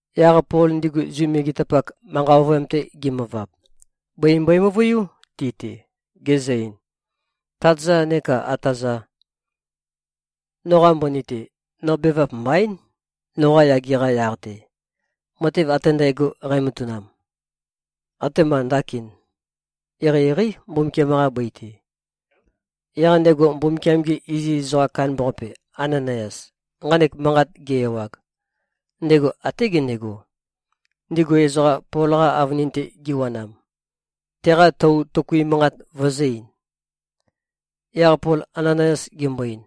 Yaq Pol ndigu Zu megetapak, manqa ovøyam-te gimøvab, bøi mbøe-møvøiú ti-te, gezø-ein, “Tát-za neka ata-za. Noqa mbøni-te, no bevap mbaín, noqa yage-qa yaq-te. Matev ate ndægo, nqæmatanam, atema ndakin, eqeieqeí Mbumbukiam-qa bøi-te.” Yaq ndego Mbumbukiam-ge iziz ezoqam kandambaqape, Ananayas, nqanek manqat ge-ewag, ndego até gendego, ndigu ezoqa Pol-qa avønin-te giwanam, teqa tou tøkui manqat vøzø̄-ein. Yaq Pol Ananayas gembo-ein,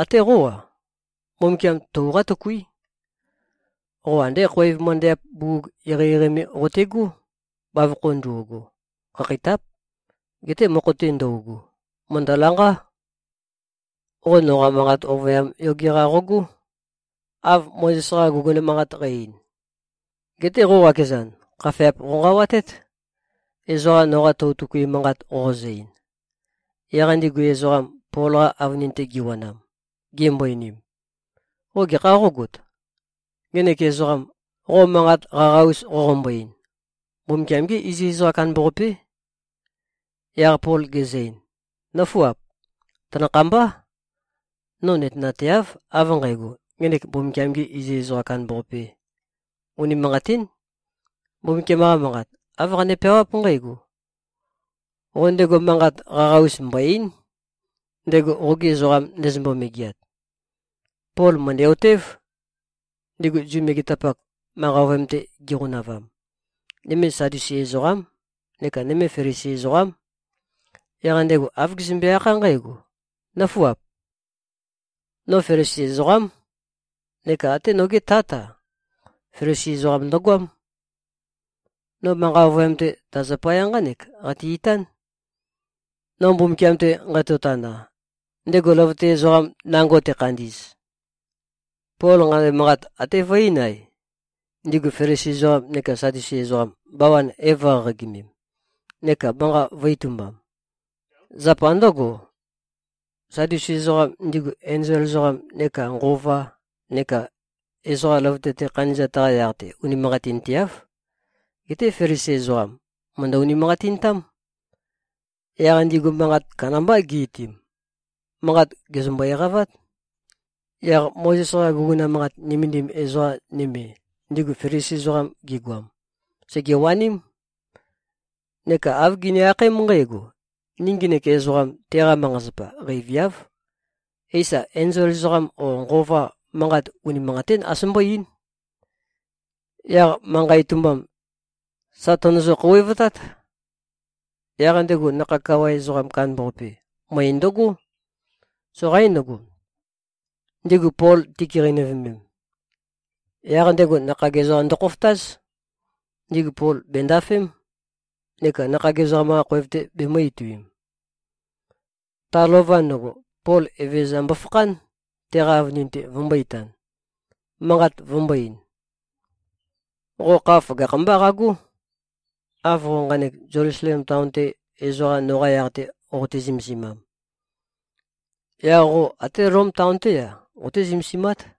“Até qó-a, Mbumbukiam tou qátøkuí. Qo andé khoev møndæap bugug eqeieqei me qote꞉gó. Bavokho ndo꞉go, khakheitáp. Geté mokho-te ndøugu, mø̀ndølanqá. Qo noqa manqa ovøyam yoge-qa qogó, av Mozes-qa guguna manqat qæ-ein. Geté qo qakezan, khafeap qonqawatét, ezoqa noqa tou tøkui manqat qoqozø-ein.” Yaq ndigu ezoqam, Pol-qa avønin-te giwanam, gimbo-einim, “Qo gekhā qógot? Ngenek ezoqam, qo manqat qaqa-us qoqombo-ein, Mbumbukiam-gé iziz ezoqam kandambaqapé.” Yaq Pol gezø-ein, “Nǿfuap. Tanakhambá. No nøtenateáv, av nqægo, ngenek Mbumbukiam-gē iziz ezoqam kandambaqapē. Unimanqatín. Mbumbukiam-qa Manqat, āv qane-peawáp nqǽgo, ‘Qo ndego manqat qaqa-us mbò-ei᷄n, ndego qogi ezoqam ndezømbo-megeat.’” Pol mø̀ndæ-otév, ndigu Zu megetapak, manqa ovøyam-te giqonavam, nøme Sadusi ezoqám, neka nøme Felisi ezoqám. Yaq ndego āv gezømbe-akhá nqǽgo, “Nǿfuap. No Felisi ezoqám. Neka até nogé tát-a, Felisi ezoqam ndøgoám. No manqa ovøyam-te, ta zapaya nqánek qate-itán, no Mbumbukiam-te nqatotana, ndego løvøte ezoqam nango tekhandi꞉z.” Pol nqanek manqat até vø-eín-ae, ndigu Felisi ezoqam neka Sadusi ezoqam, bawan é-vø̄qaqagimem, neka manqa vø̄-itumbam. Zapa ndǿgo, Sadusi ezoqam, ndigu enzol ezoqam neka nqova neka ezoqa løvøte-te khandi꞉zat-qa yaq-te unimanqatinteáv. Geté Felisi ezoqam, mø̀ndø-unimanqatintám. Yaq ndigu manqat kandambá gi-itiim. Manqa gèzømbo-eqavát. Yaq Mozes-qa guguna manqat nømendim ezoqa nøme, ndigu Felisi ezoqam gigoam, sègewaním, neka āv gini-akhaém nqǽgo, “Ni ngenek ezoqam, teqa manqa-zapa, qeiviáv. Éisa, enzol ezoqam o nqova, manqat unimanqatín as mbó-eín.” Yaq manqa itumbam, sà tønøzø-khouwevtát. Yaq ndego nakhag kawa ezoqam kandambaqape, møe ndøgó. Soqaín ndøgo, ndigu Pol tikeqeinøvemem. Yaq ndego nakhag ezoqa ndøkhofotáz. Ndigu Pol bèndafém, neka nakhag ezoqam-qa khoev-te bemø̄-ituim. Ta lova ndøgo, Pol Evezøza mbofakhán, teqa avønin-te vømbō-itan, manqat vombō-ein, “Qo kha føgakh-mbá qagó! Av qo nqanek Zelusalem taon-te, ezoqa noqa yaq-te qote-zømesimam, yaq qo até Lom taon-té-a, qoté-zømesimát.”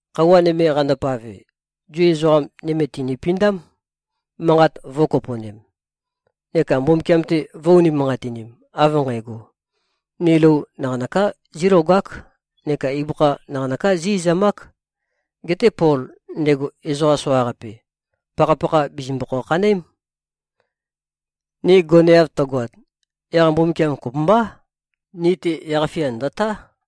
Khøuwa nøme qandopave, Zu ezoqa nøme tìnipindám, manqat vø̄kopo꞉nem neka Mbumbukiam-te vø̄-unimanqatinim, av nqægo, “Ni lou naqanøká zílogák neka ibøkha naqanøká zí-izamák. Geté Pol, ndego ezoqam soqaqape, pakhapakha bìzimbøkhæ-khanøém. Ni goneav tøgoat, yaq Mbumbukiam kopømbá, ni-te yaq-fia ndø̀tá.”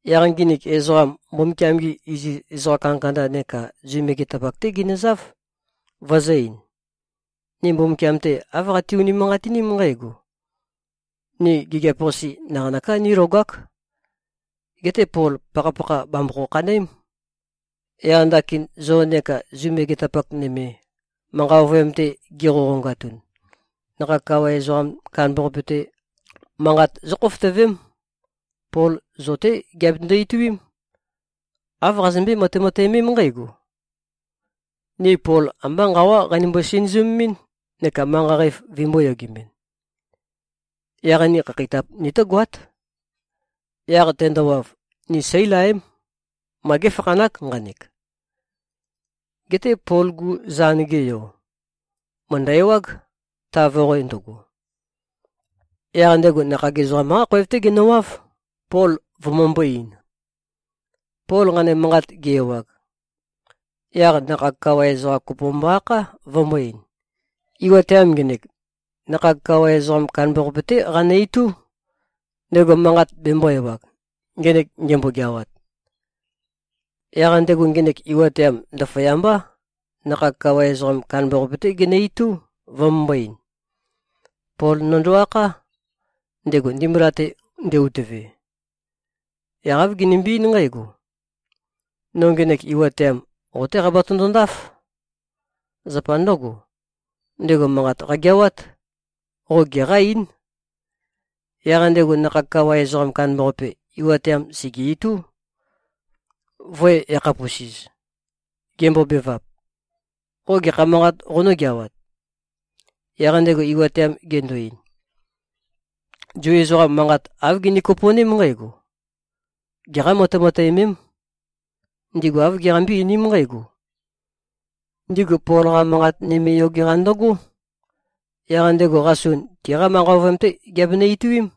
Yaq nginik ezoqam, Mbumbukiam-gi iziz ezoqa kandakanda neka Zu megetapak-té ginøzáv, vøzø̄-ein, “Ni Mbumbukiam-te, āv qati-unimanqatiním nqǽgo, ‘Ni gigiap-qase naqanøká nílogák. Geté Pol, pakhapakha bàmbøkhæ-khanøém.’ Yaq ndakin, zo neka Zu megetapak nøme, manqa ovøyam-te giqoqongatun, nakhag kawa ezoqam kandambaqape-te manqat zókhofotøvém. Pol zo-té giabetøndo-ituím. Āv qazømbøé-matemateømém nqǽgo, ‘Ni Pol ambá nqawá qeinømbo-sinøzømemɨ́n, neka manqa qæf vøimbō-yogemɨn.’ Yaq ni khakheitap nitógoát. Yaq tendowav, ni seílaém. Ma géfakhanák nqanek.” Geté Pol-gu zan-ge yo, mø̀ndø-ewág, ta voqoe ndøgo. Yaq ndego nakhag ezoqam-qá khoev-té genøwáv, Pol vømømbō-ein. Pol nqanek manqat ge-ewag, yaq nakhag kawa ezoqam kopo mbo-akhá, vømbō-ein, “Iwateam ngenek, nakhag kawa ezoqam kandambaqape-té qanø-itú, ndego manqat bembō-ewag, ngenek ngembo-geawat.” Yaq ndego, ngenek iwateam ndaføyambá, nakhag kawa ezoqam kandambaqape-té genø-itú, vømømbō-ein, “Pol nøndo-akhá, ndego ndimbula-te nde-utøve. Yaq āv genømbe-eín nqǽgo. No ngenek iwateam, qo-té qabatøndo-ndáf. Zapa ndǿgo, ndego manqat qageawát. Qo geqá-eín.” Yaq ndego nakhag kawa ezoqam kandambaqape, iwateam sège-itú, vø̄-yakhapusiz, gembobevap, “Qo gekha manqat qonǿgeawat?” Yaq ndego iwateam gendo-ein, “Zu ezoqam manqat āv gini-kopo꞉ném nqǽgo: Geqá-matemateømém. Ndigu āv giqambé-einím nqǽgo: Ndigu Pol-qa manqat nøme yoge-qa ndøgó. Yaq ndego qasun tiqa manqa ovøyam-té giabenø-ituím.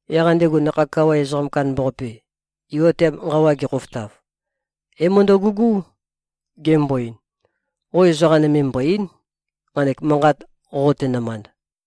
Yaq ndego nakhag kawa ezoqam kandambaqape, iwateam nqawa gekhofotav, é-møndøgugú, gembo-ein, “Qo ezoqa nøme mbò-ei᷄n, nqanek manqat qoqote-nømand.”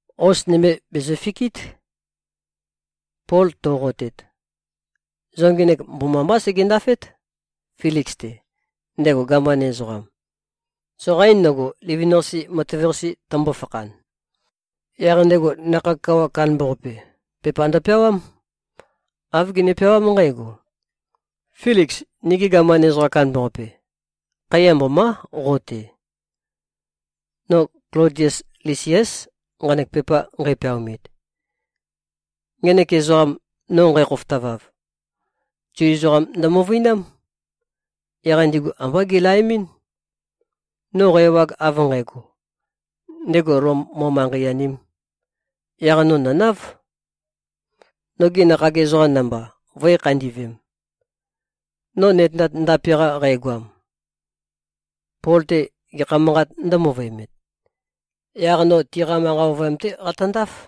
Hos nømi bèzøfikít, Pol to꞉qotet. Zo ngenek mbomambá segendafét, Filiks-te, ndego gaman ezoqam. Soqaín ndøgo, livin-qase matev-qase tømbo-fakhan.” Yaq ndego nakhag kawa kandambaqape, pepa ndøpeawám. Āv gene-peawám nqǽgo, “Filiks, nigi gaman ezoqam kandambaqape. Khaiya mbomá, qo-te. No Klodies Lisiás, nqanek pepa nqæpeaomit. Ngenek ezoqam, no nqækhofotavav, Zu ezoqam ndømøvøinám. Yaq ndigu ambá gilaemɨ́n. No qæ-ewag av nqægo, ndego Lom mo-manqei-anēm, yaq no nø̀náv, nogi nakhag ezoqam namba, vø̄i-khandi꞉vem. No nøtenat ndape-qa qægoam, Pol-te gekha manqāt ndǿmøvøemet, yaq no tiqa manqa ovøyam-té qatøndáf.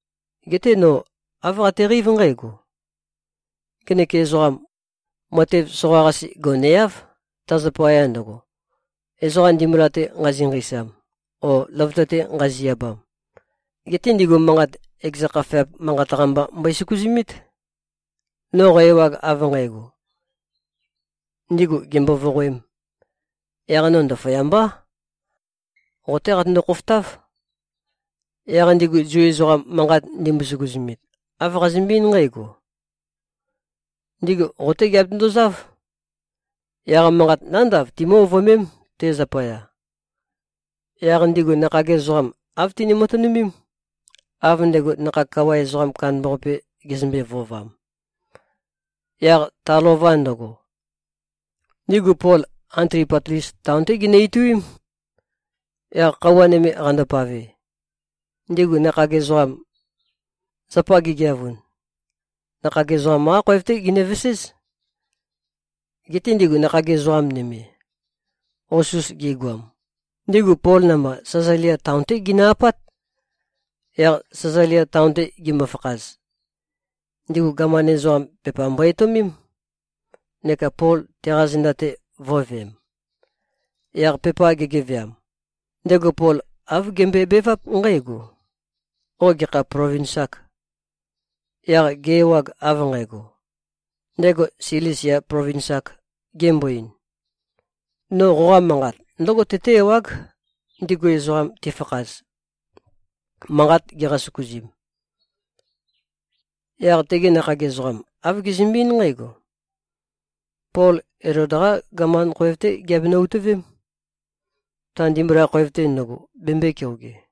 Geté no āv qateqeív nqǽgo: Ngenek ezoqam, matev soqa-qase goneáv, ta zapaya ndøgo, ezoqa ndimbula-te nqazi-nqeisam o løvøte-te nqazi-abam. Geté ndigu manqat, ekeza khafeap manqat-qa mba mbøe-søkuzumít. No qæ-ewag, av nqægo, ndigu gèmbo-voqoēm, yaq no ndaføyambá, qo-té qatøndo-khofotáv. Yaq ndigu Zu ezoqam, manqat ndimbo-søkuzumit, āv qazømbe-eín nqǽgo. Ndigu qo-té giabetøndozáv. Yaq manqat nándav timǿ-ovøemém, te zapaya.” Yaq ndigu nakhag ezoqam, āv tini-matønømém, av ndego nakhag kawa ezoqam kandambaqape gezømbe-vøovam. Yaq ta lova ndøgo, ndigu Pol Antipatlis taon-té ginø-ituím. Yaq khøuwa nøme qandopave, ndigu nakhag ezoqam, zapa gigeavun, nakhag ezoqam-qá khoev-té ginøveséz. Geté ndigu nakhag ezoqa nøme, hos-us gigoam, ndigu Pol namba, Sæzalia taon-té ginø-apát. Yaq Sæzalia taon-te gimøfakhaz, ndigu gaman ezoqam, pepa mbo-etøomém, neka Pol teqa zenda-te vø̄veem. Yaq pepa gegeveam, ndego Pol āv gembøebeváp nqǽgo, “Qo gekha plovins-âk?” Yaq ge-ewag, av nqægo, ndego Silisia plovins-āk, gembo-ein, “No qoqa manqat ndǿgo tøtǿ-ewág, ndigu ezoqam tifakhaz, manqat giqa-søkuzim.” Yaq tegi nakhag ezoqam, āv gezømbe-eín nqǽgo. Pol Elod-qá gaman khoev-té giabenø-utøvém, ta ndimbula khoev-te ndøgo bembøē-keoge.